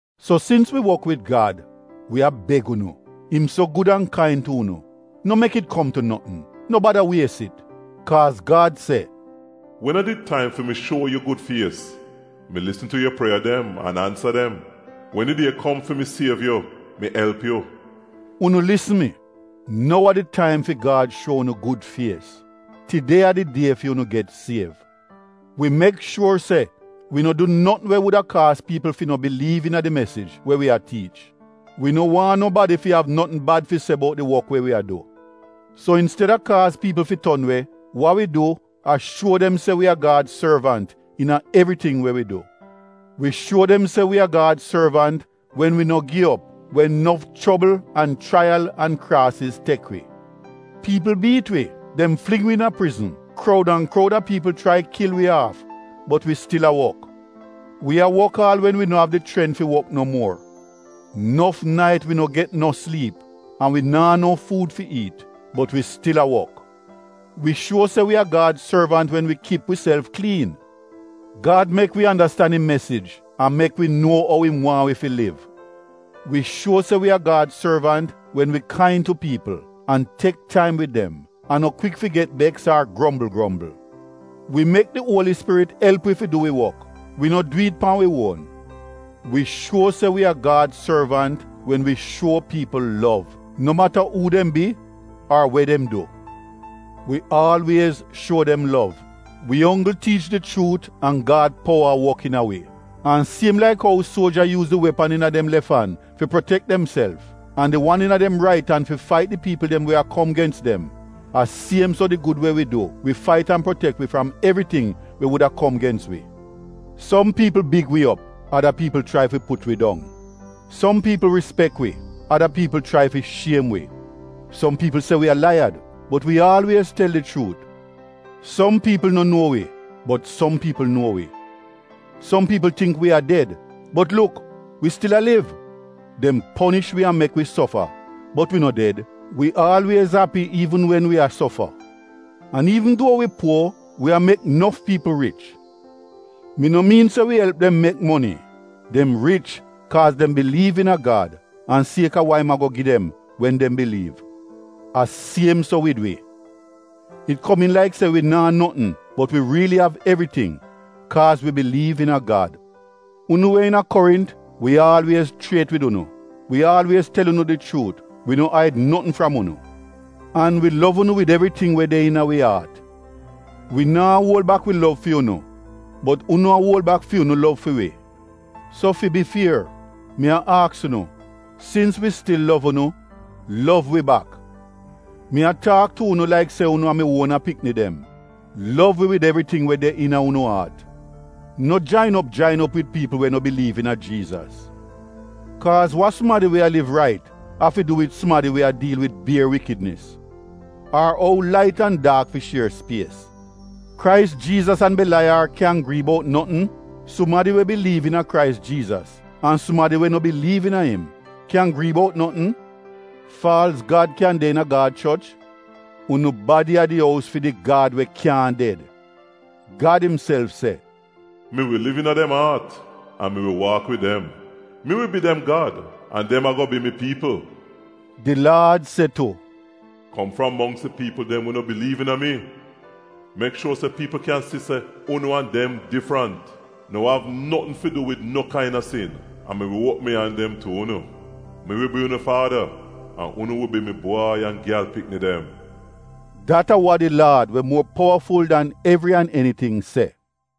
So sins wi wok wid Gad, wi a beg unu, im so gud an kain tu unu, no mek it kom tu notn, no bada wies it. Kaaz Gad se, “Wen a did taim fi mi shuo yu gud fies, mi lisn tu yu prieya dem an ansa dem. Wen di die kom fi mi siev yu, mi elp yu.” Unu lisn mi! Nou a di taim fi Gad shuo unu gud fies. Tide a di die fi unu get siev. Wi mek shuor se wi no du notn we wuda kaaz piipl fi no biliiv iina di mesij we wi a tiich. Wi no waahn nobadi fi av notn bad fi se bout di wok we wi a du. So insteda kaaz piipl fi ton we, wa wi du a shuo dem se wi a Gad sorvant iina evriting we wi du. Wi shuo dem se wi a Gad sorvant wen wi no gi op wen nof chobl an chraiyal an kraasiz tek wi. Piipl biit wi, dem fling wi iina prizn, kroud an kroud a piipl chrai kil wi aaf bot wi stil a wok. Wi a wok aal wen wi no av di chrent fi wok no muor. Nof nait wi no get no sliip an wi naa no fuud fi iit, bot wi stil a wok. Wi shuo se wi a Gad sorvant wen wi kip wiself kliin. Gad mek wi andastan im mesij an mek wi nuo ou im waahn wi fi liv. Wi shuo se wi a Gad sorvant wen wi kain tu piipl, an tek taim wid dem an no kwik fi get beks ar grombl grombl. Wi mek di Uoli Spirit elp wi fi du wi wok, wi no du it pan wi uon. Wi shuo se wi a Gad sorvant wen wi shuo piipl lov, no mata uu dem bi ar we dem du, wi aalwiez shuo dem lov. Wi onggl tiich di chuut an Gad powa a wok iina wi. An siem laik ou suoja yuuz di wepan iina dem lef an fi protek demself an di wan iina dem rait an fi fait di piipl dem we a kom gens dem a siem so di gud we wi du wi fait an protek wi fram evriting we wuda kom gens wi. Som piipl big wi op ada piipl chrai fi put wi dong. Som piipl rispek wi ada piipl chrai fi shiem wi. Som piipl se wi a laiyad bot wi aalwiez tel di chuut. Som piipl no nuo wi bot som piipl nuo wi. Som piipl tingk wi a ded bot luk wi stil a liv. Dem ponish wi an mek wi sofa bot wi no ded. Wi aalwiez api iivn wen wi a sofa. An iivn duo wi puo wi a mek nof piipl rich. Mi no miin se wi elp dem mek moni, dem rich kaaz dem biliiv iina Gad an kaaz a wa im ago gi dem wen dem biliiv. A siem so wid wi, it komiin laik se wi naa notn bot wi riili av evriting kaaz wi biliiv iina Gad. Unu we iina Korint wi aalwiez chriet wid unu; wi aalwiez tel unu di chuut wi no aid notn fram unu. An wi lov unu wid evriting we de iina wi aat. Wi naa uol bak wi lov fi unu bot unu a uol bak fi unu lov fi wi. So fi bi fier, mi a aks unu, sins wi stil lov unu, lov wi bak. Mi a taak tu unu laik se unu a mi uona pikni dem, lov wi wid evriting we de iina unu aat. No jain op jain op wid piipl we no biliiv iina Jiizas. Kaaz wa sumadi we a liv rait av fi du wid sumadi we a diil wid bier wikidnis? Ar ou lait an daak fi shier spies? Krais Jiizas an Belaiyar kyan grii bout notn? Sumadi we biliiv iina Krais Jiizas an sumadi we no biliiv iina im kyan grii bout notn? Faalz gad kyan de iina Gad choch? Unu badi a di ous fi di Gad we kyaahn ded. Gad imself se: “Mi wi liv iina dem aat an mi wi waak wid dem. Mi wi bi dem Gad an dem ago bi mi piipl.” Di Laad se tu, “Kom fram mongks di piipl dem we no biliiv iina mi, mek shuor se piipl kyan si se unu an dem difrant. No av notn fi du wid no kaina sin, an mi wi uopm mi an dem tu unu. Mi wi bi unu faada, an unu wi bi mi bwai an gyal pikni dem.” Dat a wa di Laad we muor powaful dan evri an eniting se.